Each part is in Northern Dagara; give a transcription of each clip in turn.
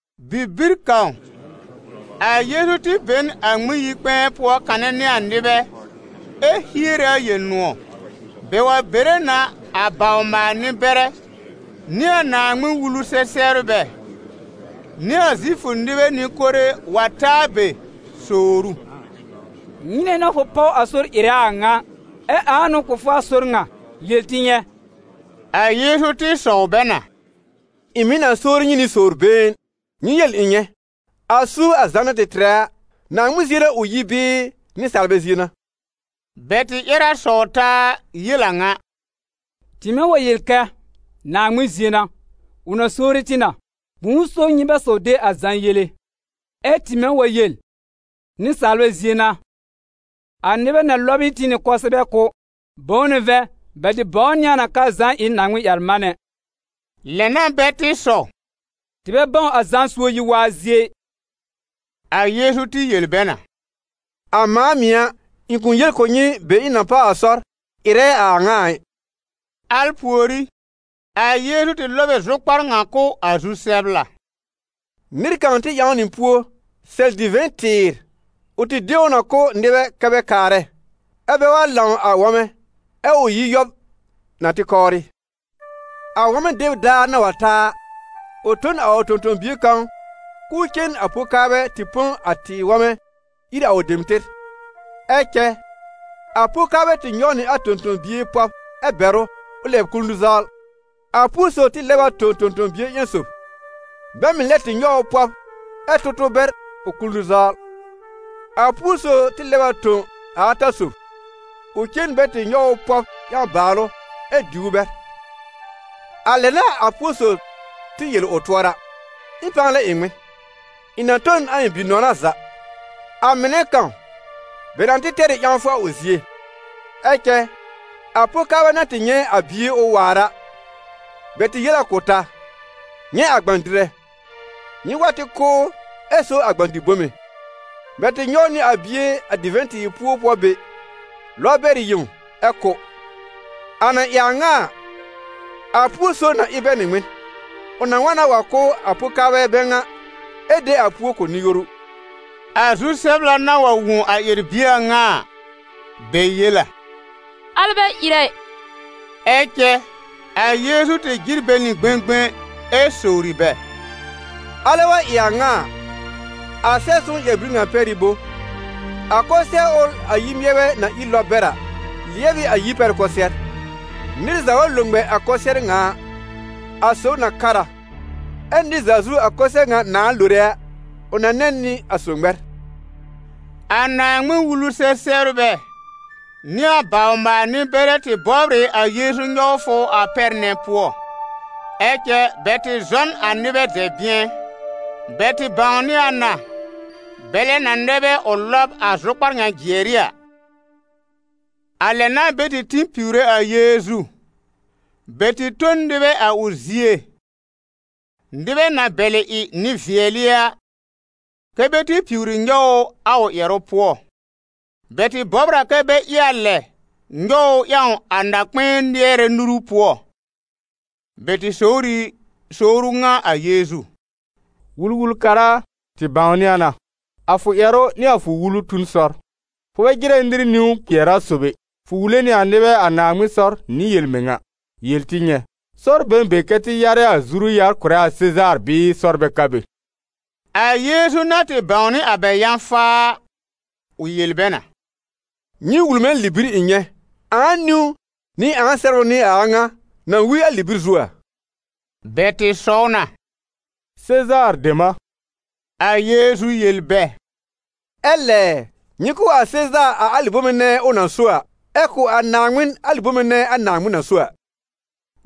Bibir kãw, a Yeezu tɩ be n a Ŋmɩn-yi-kpɛ̃ɛ pʋɔ kanɛ nɩ a nɩbɛ ɛ hiere a Yel-nʋ̃ɔ̀. Bɛ wa bere na a bawr-maal-nɩ-bɛrɛ, nɩ a Naaŋmɩn-Wulu-sɛ-sɛbrbɛ, nɩ a Zifʋ nɩbɛ nɩ-kore, wa ta a be, sowr ʋ: «Nyɩnɛ n'a fʋ páw a sɔr ɩrɛ a a ŋa? Ɛ ãa n'ʋ kʋ̀ fʋ a sɔr ŋa? Yel tɩ nyɛ̃.» A Yeezu tɩ sɔw bɛ na: «Ɩ̃ mɩ̀ na sowri nyɩ nɩ sowr-been. Nyɩ yel ɩ̃ nyɛ̃: a suob a Zã na tɩ tɩrɛ a, Naaŋmɩn zie n'a ʋ yi bɩɩ nɩsaalbɛ zie n'a?» Bɛ tɩ ƴɛr a sɔw taa yel a ŋa: «Tɩmɛ wa yel kɛ: ‹Naaŋmɩn zie n'a›, ʋ na sowri tɩ na: ‹Bʋ̃ʋ so nyɩ bɛ saw de a Zã yele?› Ɛ tɩmɛ wa yel: ‹Nɩsaalbɛ zie n'a›, a nɩbɛ na lɔb ɩ tɩ nɩ kʋsɛbɛ kʋ́, bʋ̃ʋ n'ʋ vɛ̃, bɛ tɩ bãwnɩ a na k'aa Zã ɩ n Naaŋmɩn-ƴɛr-manɛ.» Lɛ n'a bɛ tɩ sɔw: «Tɩ bɛ bãw a Zã suob yi-waa zie ɩ.» A Yeezu tɩ yel bɛ na: «A mãa mɩ̀ a, ɩ̃ kʋ̃ yel kʋ̀ nyɩ be ɩ̃ na páw a sɔr ɩrɛ a a ŋa a ɩ.» Al pùorí, a Yeezu tɩ lɔb ɩ zʋkpar ŋa kʋ̀ a zu-sɛbla: «Nɩr kãw tɩ ƴãw nɩ puo sɛl divɛ̃-tɩɩr. Ʋ tɩ de ʋ na kʋ̀ nɩbɛ kɛ́ bɛ kaarɛ, ɛ́ bɛ wa lãw a wɔmɛ, ɛ ʋ yi yɔb na tɩ kɔwrɩ. A wɔmɛ deb daar na wa ta a, ʋ tõ n a ʋ tõ-tõ-bie kãw k'ʋʋ cen a po-kaarbɛ tɩ põ a tɩɩr wɔmɛ ír a ʋ dem tɩr. Ɛ cɛ a po-kaarbɛ tɩ nyɔw nɩ a tõ-tõ-bie pɔb ɛ bɛr ʋ, ʋ lɛb kul nũ-zawl. A púo sob tɩ lɛb a tõ tõ-tõ-bie ƴẽn sob, bɛ mɩ̀ lɛ tɩ nyɔw pɔb, ɛ tʋ tʋ bɛr ʋ kul nũ-zawl. A púo sob tɩ lɛb a tõ a ata sob, ʋ cen bɛ tɩ nyɔw ʋ pɔb ƴãw bàalʋ ɛ diw ʋ bɛr. A lɛ n'a a púo sob tɩ yel ʋ tʋɔra: ‹Ɩ̃ pãa lɛ ɩ ŋmɩn? Ɩ̃ na tõ n a ɩ̃ bi-nɔna za, a mɩnɛ kãw, bɛ na tɩ tɛr ɩ ƴãwfʋ a ʋ zie!› Ɛ cɛ a po-kaarbɛ na tɩ nyɛ̃ a bie ʋ waar a, bɛ tɩ yel a kʋ̀ taa: ‹Nyɛ̃ a gbã-dɩrɛ! Nyɩ wa tɩ kʋ́ ʋ ɛ so a gbã-dɩ-bome!› Bɛ tɩ nyɔw nɩ a bie, a divɛ̃-tɩɩr puo pʋɔ be, lɔb bɛr yẽw ɛ kʋ́.» «A na ɩ a ŋa a, a púo sob na ɩ bɛ nɩ ŋmɩn? Ʋ na wa na wa kʋ́ a po-kaarbɛ bɛ ŋa ɛ de a púo kʋ̀ nɩ-yoru.» A zu-sɛbla na wa wõ a ƴɛr-bie a ŋa a, bɛ yel a: «Al bɛ ɩrɛ ɩ!» Ɛ cɛ a Yeezu tɩ jɩr bɛ nɩ gbẽgbẽ ɛ sowri bɛ: «Alɛ wa ɩ a ŋa a, a Sɛb-sõw ƴɛr-bir ŋa pɛr ɩ bo: ‹A kʋsɩɛr ʋl a yir-mɩɛrbɛ na ír lɔb bɛr a, lɩɛb ɩ a yir pɛr kʋsɩɛr?› Nɩr za wa lo ŋmɛ a kʋsɩɛr ŋa a, a sob na kar a, ɛ nɩr za zu a kʋsɩɛr ŋa nãa lore a, ʋ na nɛ nɩ a sob ŋmɛr.» A Naaŋmɩn-Wulu-sɛ-sɛbrbɛ nɩ a bawr-maal-nɩ-bɛrɛ tɩ bɔbr ɩ a Yeezu nyɔwfʋ a pɛr nɛ pʋɔ, ɛ cɛ bɛ tɩ zɔ n a nɩbɛ dɛ̃bɩ̃ɛ; bɛ tɩ bãwnɩ a na bɛlɛ na nɛ bɛ ʋ lɔb a zʋkpar jɩɛr ɩ a. A lɛ n'a bɛ tɩ tĩ piwre a Yeezu. Bɛ tɩ tõ n nɩbɛ a ʋ zie, nɩbɛ na bɛlɩ ɩ nɩ-vɩɛlɩ a, kɛ́ bɛ tɩ piwri nyɔw ʋ a ʋ ƴɛrʋ pʋɔ. Bɛ tɩ bɔbr kɛ bɛ ɩ a lɛ nyɔw ʋ ƴãw a na-kpɛ̃ɛ lɩɛrɛ nuru pʋɔ. Bɛ tɩ sowr ɩ sowru ŋa a Yeezu: «Wul-wul-kara a, tɩ bãwnɩ a na, a fʋ ƴɛrʋ nɩ a fʋ wulu tu n sɔr, fʋ bɛ jɩrɛ nɩr niwn kpɩɛr a sob ɛ, fʋ wule nɩ a nɩbɛ a Naaŋmɩn sɔr nɩ yel-mɩŋa. Yel tɩ nyɛ̃: sɔr be n be kɛ́ tɩ yarɛ a zuru-yar kʋ̀rɛ a Sezaar bɩɩ sɔr bɛ ka be?» A Yeezu na tɩ bãwnɩ a bɛ yã-faa a, ʋ yel bɛ na: «Nyɩ wul mɛ̃ libir ɩ̃ nyɛ̃. Ãa niwn nɩ ãa sɛbrʋ n'ɩ a a ŋa na wi a libir zu a?» Bɛ tɩ sɔw na: «Sezaar dem a.» A Yeezu yel bɛ: «Ɛ lɛ̀ɛ, nyɩ kʋ̀ a Sezaar a alɩ bome nɛ ʋ na so a, ɛ kʋ̀ a Naaŋmɩn alɩ bome nɛ a Naaŋmɩn na so a.»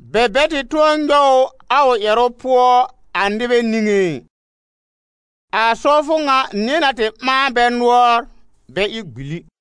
Bɛ bɛ tɩ tʋ̃ɔ nyɔw ʋ a ʋ ƴɛrʋ pʋɔ a nɩbɛ niŋé ɩ. A sɔwfʋ ŋa nɩ̃ɛ na tɩ ɓãa bɛ nʋɔr bɛ ɩ gbili.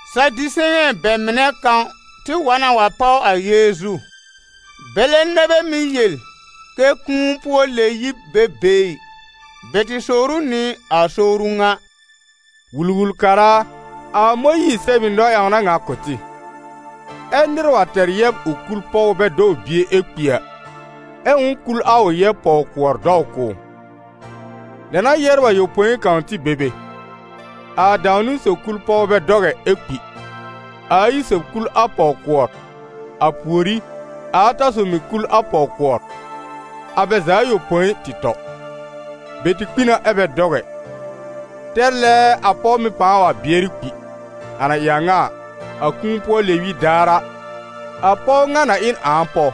Sadiseyɛ̃ bɛ mɩnɛ kãw tɩ wa na wa páw a Yeezu. Bɛlɛ nɛ bɛ mɩ́ yel kɛ kũu-pʋɔ-lɛ-yib bɛ be ɩ. Bɛ tɩ sowr ʋ nɩ a sowru ŋa: «Wul-wul-kara a, a Mõyiir sɛb ɩ nɔ-ƴãwna ŋa kʋ̀ tɩ: ‹Ɛ́ nɩr wa tɛr yɛb ʋ kul pɔw bɛ dɔw bie ɛ kpi a, ɛ ʋ̃ʋ kul a ʋ yɛb pɔw-kʋɔr dɔw kʋ̀ ʋ.› Lɛ n'a yɛbr ayopõi kãw tɩ be be: a dãw-niwn sob kul pɔw bɛ dɔw ɛ, ɛ kpi; a ayi sob kul a pɔw-kʋɔr, a pùorí, a ata sob mɩ̀ kul a pɔw-kʋɔr. A bɛ za ayopõi tɩ tɔ. Bɛ tɩ kpi na ɛ bɛ dɔw ɛ. Tɛr lɛɛɛ a pɔw mɩ̀ pãa wa bɩɛrɩ kpi. A na ɩ a ŋa a, a kũu-pʋɔ-lɛ-yib daar a, a pɔw ŋa na ɩ n ãa pɔw,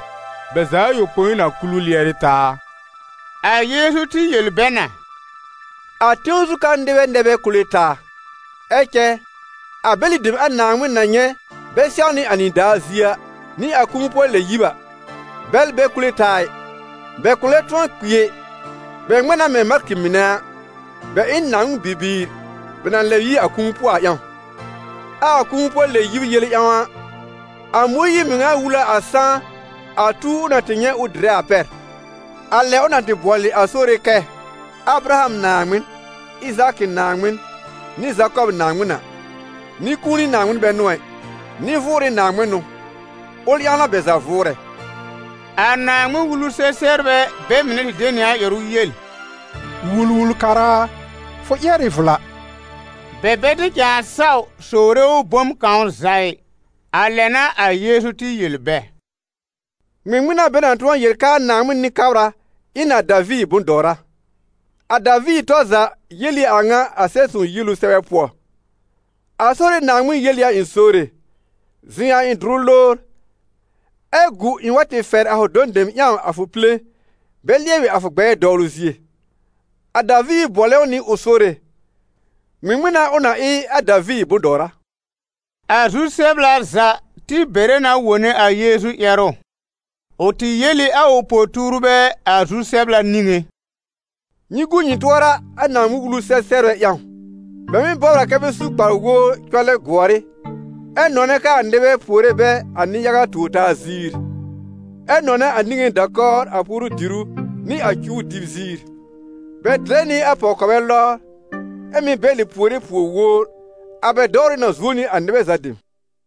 bɛ za ayopõi na kul ʋ lɩɛrɩ taa a?» A Yeezu tɩ yel bɛ na: «A tẽw zu ka nɩbɛ nɛ bɛ kule taa. Ɛ cɛ a bɛlɩ dem a Naaŋmɩn na nyɛ̃ bɛ sɛwnɩ a nɩdaar zie a, nɩ a kũu-pʋɔ-lɛ-yib a, bɛl bɛ kule taa ɩ, bɛ kʋ̃ lɛ tʋ̃ɔ kpi ɛ: bɛ ŋmɛ̃ na mɛ̃ malkɩ mɩnɛ a, bɛ ɩ n Naaŋmɩn bibiir, bɛ na lɛb yi a kũu pʋɔ a ƴãw. Ɛ a kũu-pʋɔ-lɛ-yib yele ƴãw a, a Mõyiir mɩŋa wul a a sãá a tuw ʋ na tɩ nyɛ̃ ʋ dɩrɛ a pɛr, a lɛ ʋ na tɩ bʋɔlɩ a Sore kɛ: ‹ Abraham Naaŋmɩn, Ɩzaakɩ Naaŋmɩn, nɩ Zakɔb Naaŋmɩn a.› Nɩ-kũuni Naaŋmɩn bɛ n'ʋ ɛ, nɩ-vʋʋrɩ Naaŋmɩn n'ʋ. Ʋl ƴãw n'a bɛ za vʋʋrɛ.» A Naaŋmɩn-Wulu-sɛ-sɛbrbɛ bɛ mɩnɛ tɩ de nɩ a ƴɛrʋ yel: «Wul-wul-kara a, fʋ ƴɛr ɩ vla!» Bɛ bɛ tɩ cãa saw sowre ʋ bom kãw za ɩ. A lɛ n'a a Yeezu tɩ yel bɛ: «Ŋmɩŋmɩn n'a bɛ na tʋ̃ɔ yel kɛ a Naaŋmɩn Nɩ-kabra ɩ n a Daviir bʋ̃-dɔwra? A Daviir tɔr za yel ɩ a ŋa a Sɛb-sõw yielu sɛbɛ pʋɔ: ‹A Sore Naaŋmɩn yel ɩ a ɩ̃ Sore: zɩ̃ a ɩ̃ dʋrʋ lowr ɛ gu ɩ̃ wa tɩ fɛr a fʋ dɔ̃ dem ƴãw a fʋ pile, bɛ lɩɛbɩ a fʋ gbɛɛ dɔwlʋ zie.› A Daviir bʋɔlɛ ʋ nɩ ʋ Sore, ŋmɩŋmɩn n'a ʋ na ɩ a Daviir bʋ̃-dɔwra?» A zu-sɛbla za tɩ bɛrɛ na wone a Yeezu ƴɛrʋ. Ʋ tɩ yel ɩ a ʋ po-tuurbɛ a zu-sɛbla niŋé: «Nyɩ gu nyɩ tʋɔra a Naaŋmɩn-Wulu-sɛ-sɛbrbɛ ƴãw: bɛ mɩ́ bɔbr a kɛ bɛ su kpar-wowr cɔlɛ gʋɔr ɩ, ɛ nɔnɛ kɛ a nɩbɛ puore bɛ a nɩ-yaga tuor-taa ziir, ɛ nɔnɛ a niŋé da-kɔwr a puoru-dìrú nɩ a cuwr dɩb ziir. Bɛ dɩrɛ nɩ a pɔw-kɔbɛ lɔbr, ɛ mɩ́ bɛlɩ puore puor-wowr. A bɛ dɔwrʋ na zuo nɩ a nɩbɛ za dem.»